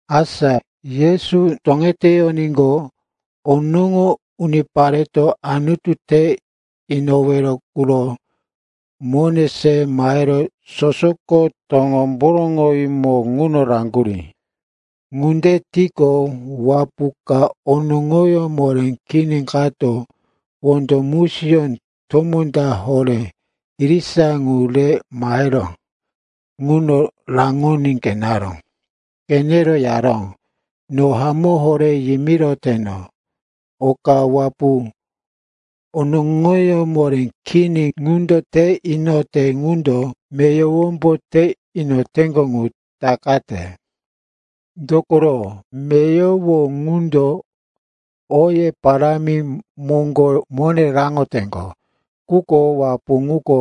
Asa Yesu toŋeteyoníqo, onoŋo unipareto Anutu te inowero quro mone se mahero sosoko toŋomboroŋowímo ŋuno raŋgurí. Ŋunde tiqo, wapu onoŋoyó moré kini kato wondo musiyó tomó ta horé irisa qu re mahero ŋuno raŋoní qeneró. Qenero yaró, “No hamó horé yimiroteno, oka wapu onoŋoyó moré kini ŋundo te inote ŋundo meyowombo te inoyoteŋgo ŋu takate. Dokoro meyowo ŋundo oye parámi moŋgo mone raŋoteŋgo. Quko wapu ŋuko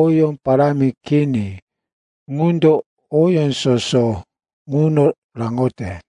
oyó parámi kini qundo oyó soso ŋuno raŋote.”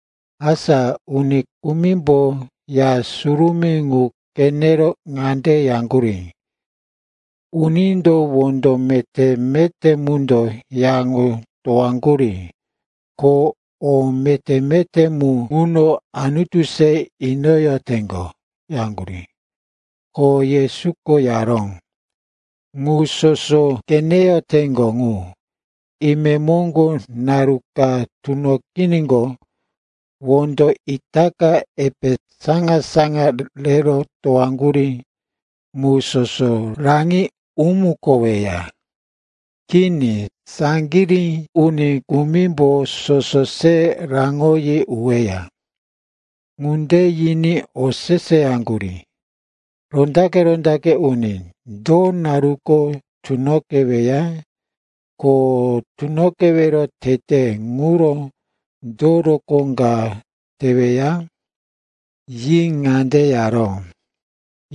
Asa uni kumimbo Ya Surumí ŋu qenero ŋande yaŋgurí, “Unindo wondo meté-meté mundo ya ŋu towaŋgurí, ko o meté-meté mu ŋuno Anutu se inoyoteŋgo,” yaŋgurí. Ko Yesuko yaró, “Ŋu soso qeneyoteŋgo ŋu, imemoŋgo naru ka tunoqiníqo, wondo itaka epe saŋa-saŋa rero towaŋgurí mu soso raŋi umukoweya. Kini, saŋgirí uni kumimbo soso se raŋoyi uweya.” Ŋunde yiní oseseyaŋgurí, “Rondaqe-rondaqe uni, do naruko tunoqeweya? Ko tunoqewero tete ŋuro do rokó ka teweya?” Yi ŋande yaró,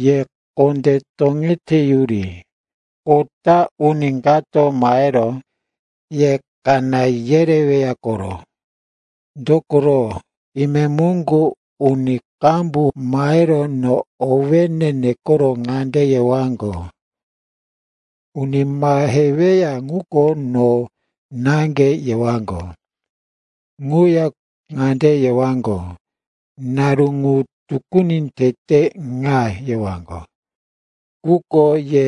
“Ye kondé toŋeteyuri. Kota uni kato mahero ye kaná yereweya koro. Dokoro, imemoŋgo uni qambu mahero no owéne nekoro ŋande yewaŋgo, ‘Uni maheweya ŋuko no naŋge!’ yewaŋgo. Ŋuya ŋande yewaŋgo, ‘Naru ŋu tukuni tete ŋa!’ yewaŋgo. Quko ye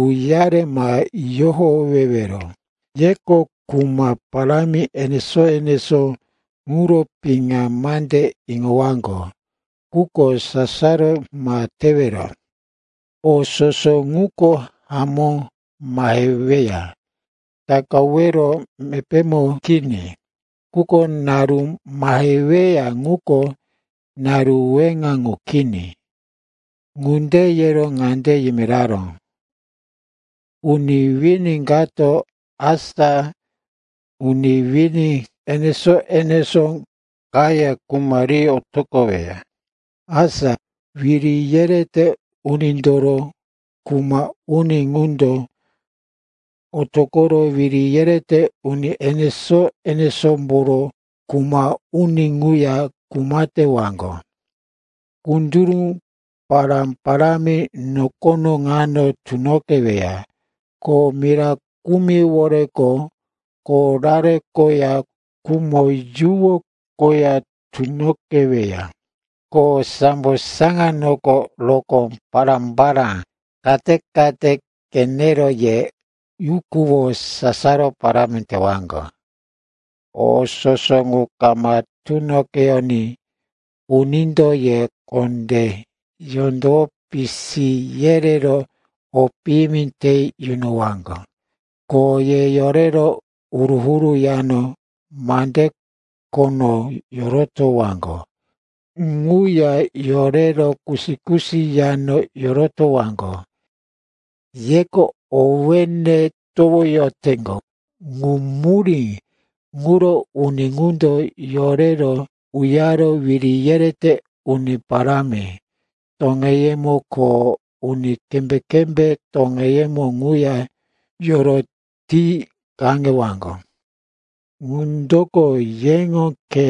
uyare ma yohowewero. Yeko kuma parámi enesó-enesó ŋuro piŋa mande iŋowaŋgo, quko sasaro ma tewero. O soso ŋuko hamó maheweya, takawero mepémo kini. Quko naru maheweya ŋuko naru weŋa qu kini.” Ŋunde yero ŋande yimiraró, “Uni wini kato asa uni wini enesó-enesó kaya kuma ri otoqoweya. Asa wiri yerete unindoro kuma uni qundo otoqoro wiri yerete uni enesó-enesómboro kuma uni quya kuma tewaŋgo. Kunduru pará-parámi nokono ŋano tunoqeweya. Ko mira kumiworeko korare koya khumo yuwo koya tunoqeweya. Ko sambo saŋanoko rokó pará-pará kate-kate qenero ye yukuwo sasaro parámi tewaŋgo. “O soso ŋu kama tunoqeyoní unindo ye kondé yondowo pisi yerero o piyimi te yunowaŋgo. Ko ye yorero huru-huru yano mande khono yorotowaŋgo ŋuya yorero kusi-kusi yano yorotowaŋgo. Yeko owéne towoyoteŋgo, ŋu murí ŋuro uni ŋundo yorero uyare wiri yerete uni parámi toŋeyemo ko uni kembé-kembé toŋeyemo ŋuya yoroti kaŋewaŋgo. Ŋundoko yeŋo khe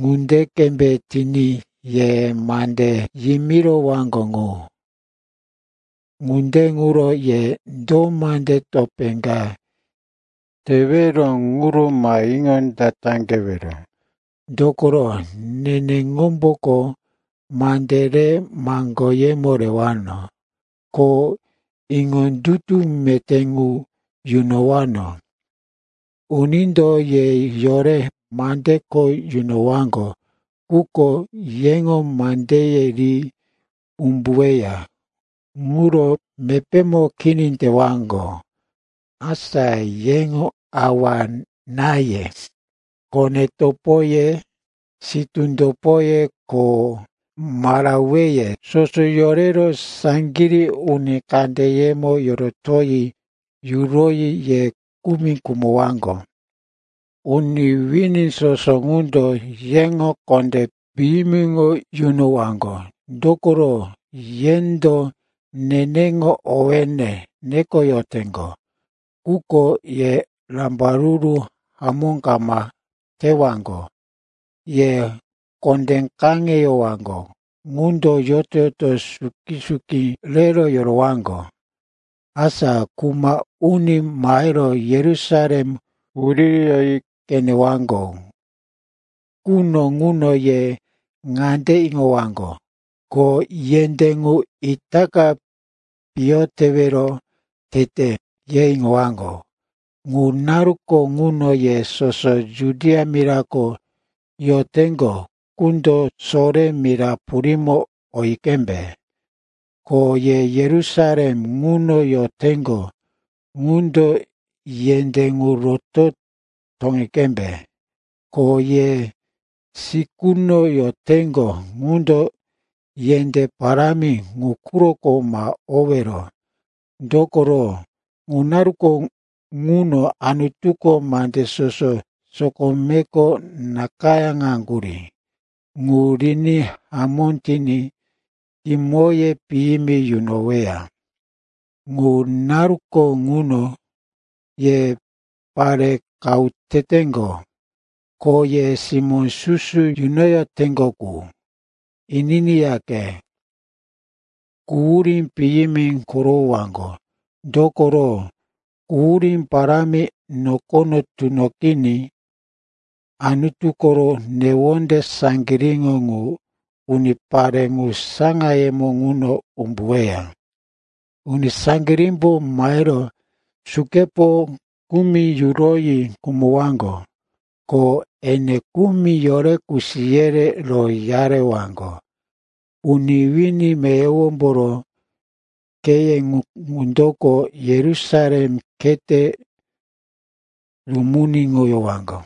ŋunde qembe tiní ye mande yimirowaŋgo ŋu. Ŋunde ŋuro ye do mande topé ka tewero ŋuro ma iŋondataqewero. Dokoro neneŋomboko mande rero maŋgoyemo rewano, ko iŋondutu meté ŋu yunowano. Unindo ye yore mande kho yunowaŋgo quko yeŋo mandeye ri umbuweya ŋuro mepémo kini tewaŋgo. Asa yeŋo awa-náye, kone-topoye, sitú topoye ko maraweye, soso yorero saŋgirí uni kandeyemo yorotoyi yuroyi ye kumi khumowaŋgo. Uni wini soso ŋundo yeŋo kondé piyimiŋo yunowaŋgo, dokoro yendo neneŋo owéne nekoyoteŋgo. Quko ye rambaruru hamó kama tewaŋgo. Ye kondé kaŋewaŋgo ŋundo yoto-yoto suki-suki rero yorowaŋgo. “Asa kuma uni mahero Yerusalem wuririyoyi qenewaŋgo quno ŋuno ye ŋande iŋowaŋgo, ko yendé ŋu itaka piyo tewero tete, ye iŋowaŋgo. Ŋu naruko ŋuno ye soso Judia mirako yoteŋgo qundo sore mira purímo oyi qembe. Ko ye Yerusalem ŋuno yoteŋgo qundo yendé ŋu roto toŋi qembe. Ko ye sikuno yoteŋgo qundo yendé parámi ŋu quroko ma owero. Dokoro ŋu naruko ŋuno Anutuko mande soso sokomeko nakayáŋaŋgurí ŋu riní hamó tiní kimoye piyimi yunoweya. Ŋu naruko ŋuno ye pare qahu teteŋgo, ko ye simó susu yunoyoteŋgo qu, ininiyaqe, quhurí piyimi korowowaŋgo. Dokoro quhurí parámi nokono tunoqiní, Anutu koro newonde saŋgiríŋo ŋu unipare ŋu saŋayemo ŋuno umbuweya. Uni saŋgirímbo mahero sukepo kumi yuroyi khumowaŋgo. Ko ene kumi yorero kusi yerero uyarewaŋgo. Uni wini meyowomboro kheye ŋundoko Yerusalem khete rumuniŋowaŋgo,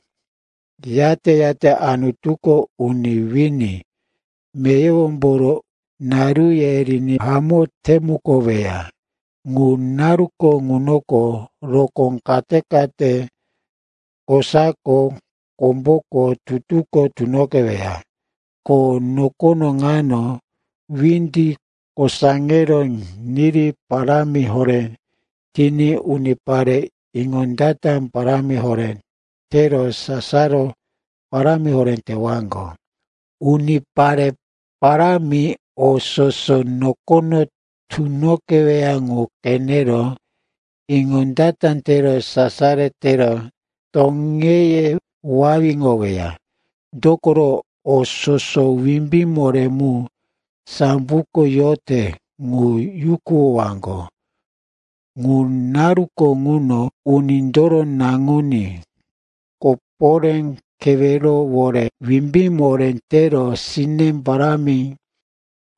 yate-yate Anutuko uni wini meyowomboro naruye riní hamó temukoweya. “Ŋu naruko ŋunoko rokó kate-kate kosako, komboko, tutuko tunoqeweya. Ko nokono ŋano windi kosaŋero niri parámi horé tiní unipare iŋondata parámi horé tero sasaro parámi horé tewaŋgo. Unipare parámi o soso nokono tunoqeweya ŋu qenero iŋondata tero sasaro tero toŋeye wawiŋoweya. Dokoro o soso wimbí moré mu samboko yote qu yukuwowaŋgo. Ŋu naruko ŋuno Unindoro Naŋuní koporé kewerowore wimbí moré tero sine parámi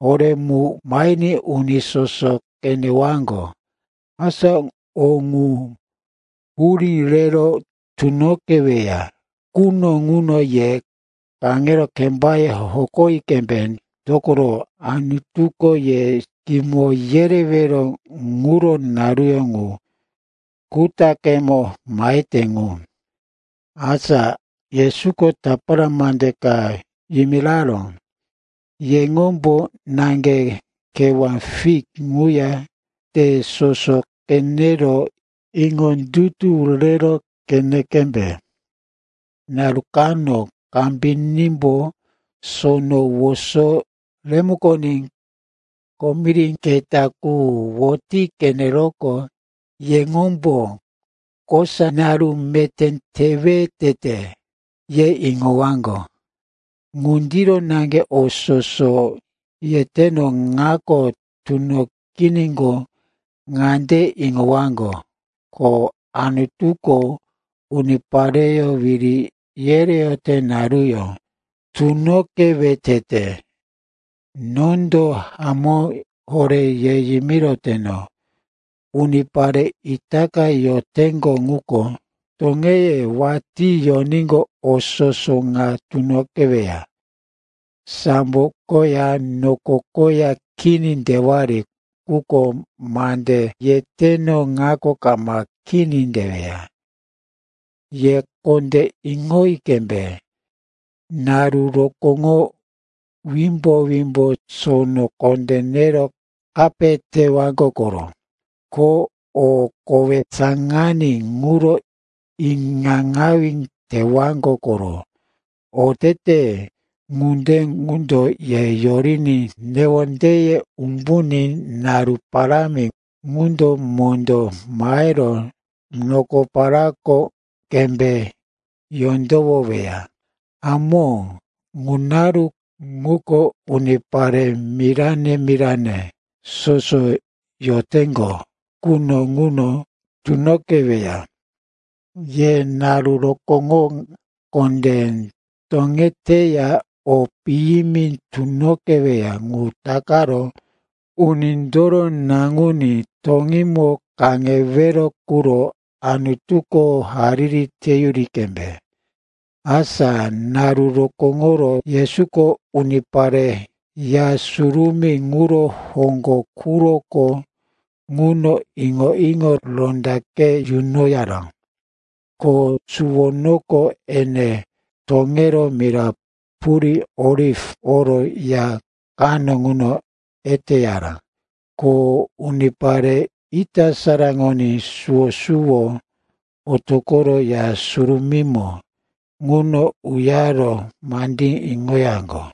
horémo mahiní unipare soso qenewaŋgo. Asa o ŋu hurí rero tunoqeweya quno ŋuno ye kaŋero kembaye hokoyi qembe, dokoro Anutuko ye kimo yerewero ŋuro naruyó ŋu kutaqemo mahete ŋu.” Asa Yesuko tapara mande ka yimiraró, “Yeŋombo naŋge kewá fik ŋuya te soso qenero iŋondutu rero qeni qembe. Naru kano kambinímbo sono woso remukoní komiri keta qu woti qeneroqo, yeŋombo, kosa naru meté tewe tete, ye iŋowaŋgo. Ŋundiro naŋge o soso yeteno ŋako tunoqiníqo, ŋande iŋowaŋgo, ko Anutuko unipareyó wiri yereyote naruyó tunoqewe tete. Nondo hamó horé ye yimiroteno, unipare itaka yoroteŋgo quko toŋeye watí yoníqo, o soso ŋa tunoqeweya. Sambo koya noko koya kini tewari, quko mande yeteno ŋako kama kini teweya. “Ye kondé iŋoyi qembe. Naru rokóŋo wimbo-wimbo sono kondé nero kape tewaŋgo koro. Ko o kowe saŋaní quro iŋaŋawí tewaŋgo koro. Otete ŋunde qundo ye yoriní newondeye umbuní naru parámi ŋundo mondó mahero nokoparako qembe yondowoweya. Hamó, ŋu naru ŋuko unipare mirane-mirane soso yoteŋgo quno ŋuno tunoqeweya. Ye naru rokóŋo kondé toŋeteya o piyimi tunoqeweya ŋu takaro Unindoro Naŋuní toŋímo kaŋewero quro Anutuko hariri teyuri qembe.” Asa naru rokóŋoro Yesuko unipare Ya Surumí ŋuro hoŋgo quroko ŋuno iŋo-iŋo rondaqe yunoyaró. Ko suwonoko ene toŋero mira purí Oliv oro ya kano ŋuno eteyaró. Ko unipare ita saraŋoní suwo-suwo otoqoro Ya Surumímo ŋuno uyaro mandí iŋoyaŋgo.